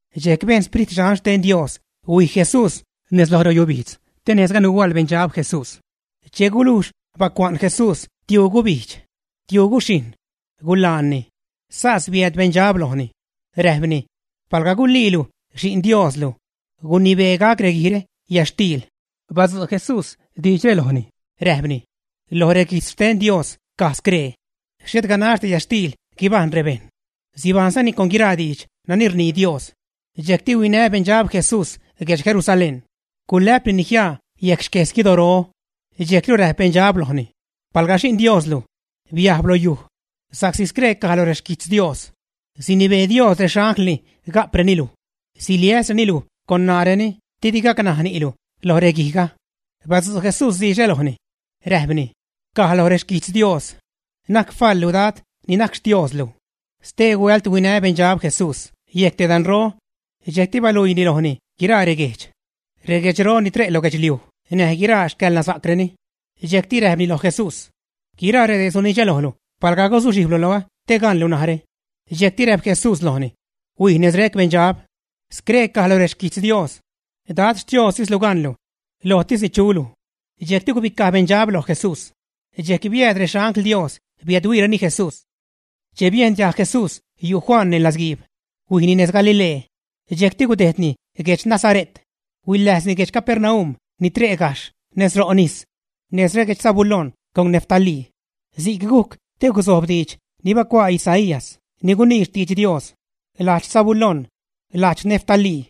Dxejc bejn Sprit Dxan xten Dios huij Jesús nez lo reyubijdz te nejzga nuhuaḻ beṉdxab Jesús. Che gulujx bacua'n Jesús tiuu gubijdx, tiuu guxhijṉ, gulaanni. Sas biääd beṉdxab lojni, räjpni: ―Palga guliilu Xi'n Dioslu, gunibee gac reguijre yätxtiil. Badzu' Jesús diidxre lojni, räjpni: ―Loj reguijtz xten Dios caj scree: “Xhet ganaxdi yäḻtxtiil guibajṉ rebejṉ; sibajṉzani con guiraa diidx nani rnii Dios.” Dxejcti huinä beṉdxab Jesús guedx Jerusalén. Gulä'pnini jiaa yejc xques guidoro. Dxejcru räjp beṉdxab lojni: ―Palga Xi'n Dios luj, bitiäjs lo yujli, sa'csi scree caj loj rexquijtz Dios: Sinibee Dios rexanglni ga'preni luj; siliäsreni luj con ṉaareni didi gacnaj ni'lu lo reguijga. Badzu' Jesús diidxre lojni, räjpni: ―Caj loj rexquijtz Dios: “Na'c faḻlu Dad ni najc Xtioslu.” Stee huält huinä beṉdxab Jesús yejc te danro. Dxejcti baluiini lojni guiraa reguejdx, reguedxro ni tre' lo guedxliuj näj guiraa xcäḻnasa'creni. Dxejcti räjpni loj Jesús: ―Guiraa redee sunidxä lojlu palga guzuxhijblu nez loä te gaṉlu narä. Dxejcti räjp Jesús lojni: ―¡Huij nez rec beṉdxab! Scree caj loj rexquijtz Dios: “Dad Xtiostislu gaṉlu; lojtisni chulu.” Dxejcti gubicaj beṉdxab loj Jesús. Dxejc biääd rexangl Dios biädhuiireni Jesús. Che biejn diajg Jesús yu' Juan neṉ ladzguiib, huijni nez Galilee. Dxejcti gudejdni guedx Nasare't, huiläjzni guedx Capernaum ni tre' gajxh nez ro' nis, nez reguejdx Zabulón con Neftalí. Si'c gujc te guzojb diidx ni bacuaa Isaías ni gunii xtidx Dios: Lajdx Zabulón, lajdx Neftalí,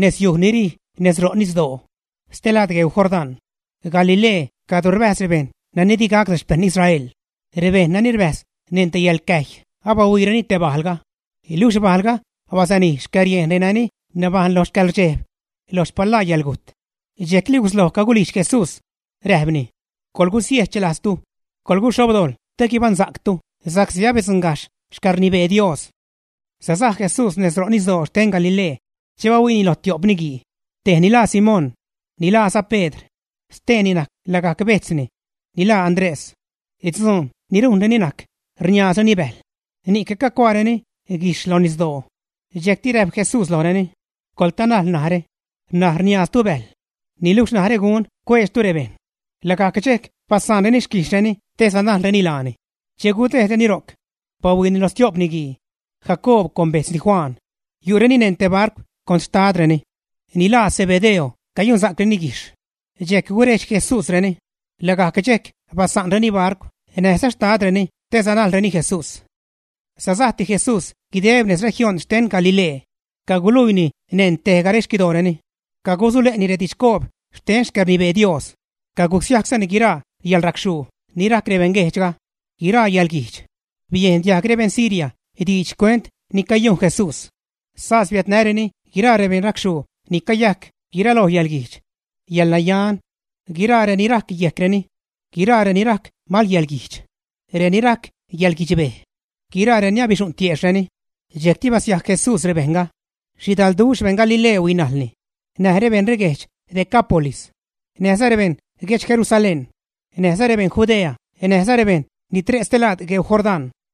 nezyuj ni rij nez ro' nisdoo, stelaad gueu Jordán, Galilee cadro rbäjz rebejṉ nani di gac rexpeṉ Israel. Rebejṉ nani rbäjz neṉ te yäḻcäjy abahuiireni te bajlga, luxh bajlga basanij xcäriejn renani nabajṉ lo xcäḻrdxejb, lo xpalaa yäḻgujt. Dxejcli gusloj cagulijdx Jesús, räjpni: ―Coḻgusiejchlajztu, coḻguxhobdojḻ te guibaṉsa'ctu sa'csi abidzuṉgajxh xcäḻrnibee Dios. Sasaj Jesús nez ro' nisdoo xten Galilee che bahuiini lo tio'p niguii. Tejni laa Simón, ni laaza Pedr. Steeni najc lagajc bejtzni, ni laa Andrés. Dzuun ni rujnreni najc rniaazreni bäjl, ni'c cacuaareni guijxh lo nisdoo. Dxejcti räjp Jesús lojreni: ―Coḻtanajl narä. N̲aj riniaaztu bäjl, niluxh narä gunä cueedxtu rebejṉ. Lagajc dxejc basa'nreni xquijxhreni te sanajlreni laani. Che gudejdreni ro'c, bahuiini loj stio'p niguii, Jacoob con bejtzni Juan. Yu'reni neṉ te barcw con xtadreni, ni laa Zebedeo cayunsa'creni guijxh. Dxejc gurejdx Jesúsreni. Lagajc dxejc basa'nreni barcw näjza xtadreni te sanajlreni Jesús. Sasajti Jesús guideb nez región xten Galilee, caguluiini neṉ tejga rexquidooreni. Cagusule'ni redidxcoob xten xcäḻrnibee Dios. Cagusiajczani guiraa yäḻracxhuu ni rajc rebejṉ guejdxga, guiraa yäḻguijdx. Biejn diajg rebeṉ Siria diidx xcuent ni cayujn Jesús. Sas biädnäreni guiraa rebeṉracxhuu ni cayajc guiraloj yäḻguijdx, yäḻnayan; guiraa reni rajc yejcreni, guiraa reni rajc malyäḻguijdx, reni rajc yäḻguidxbej, guiraareni abixu'ṉ tiejxhreni. Dxejcti basiajc Jesús rebejṉga. Xhidalduxh beṉ Galilee huinajlni, näj rebeṉ reguedx Decápolis, näjza rebeṉ guedx Jerusalén, näjza rebeṉ Judea näjza rebejṉ ni tre' stelaad gueu Jordán.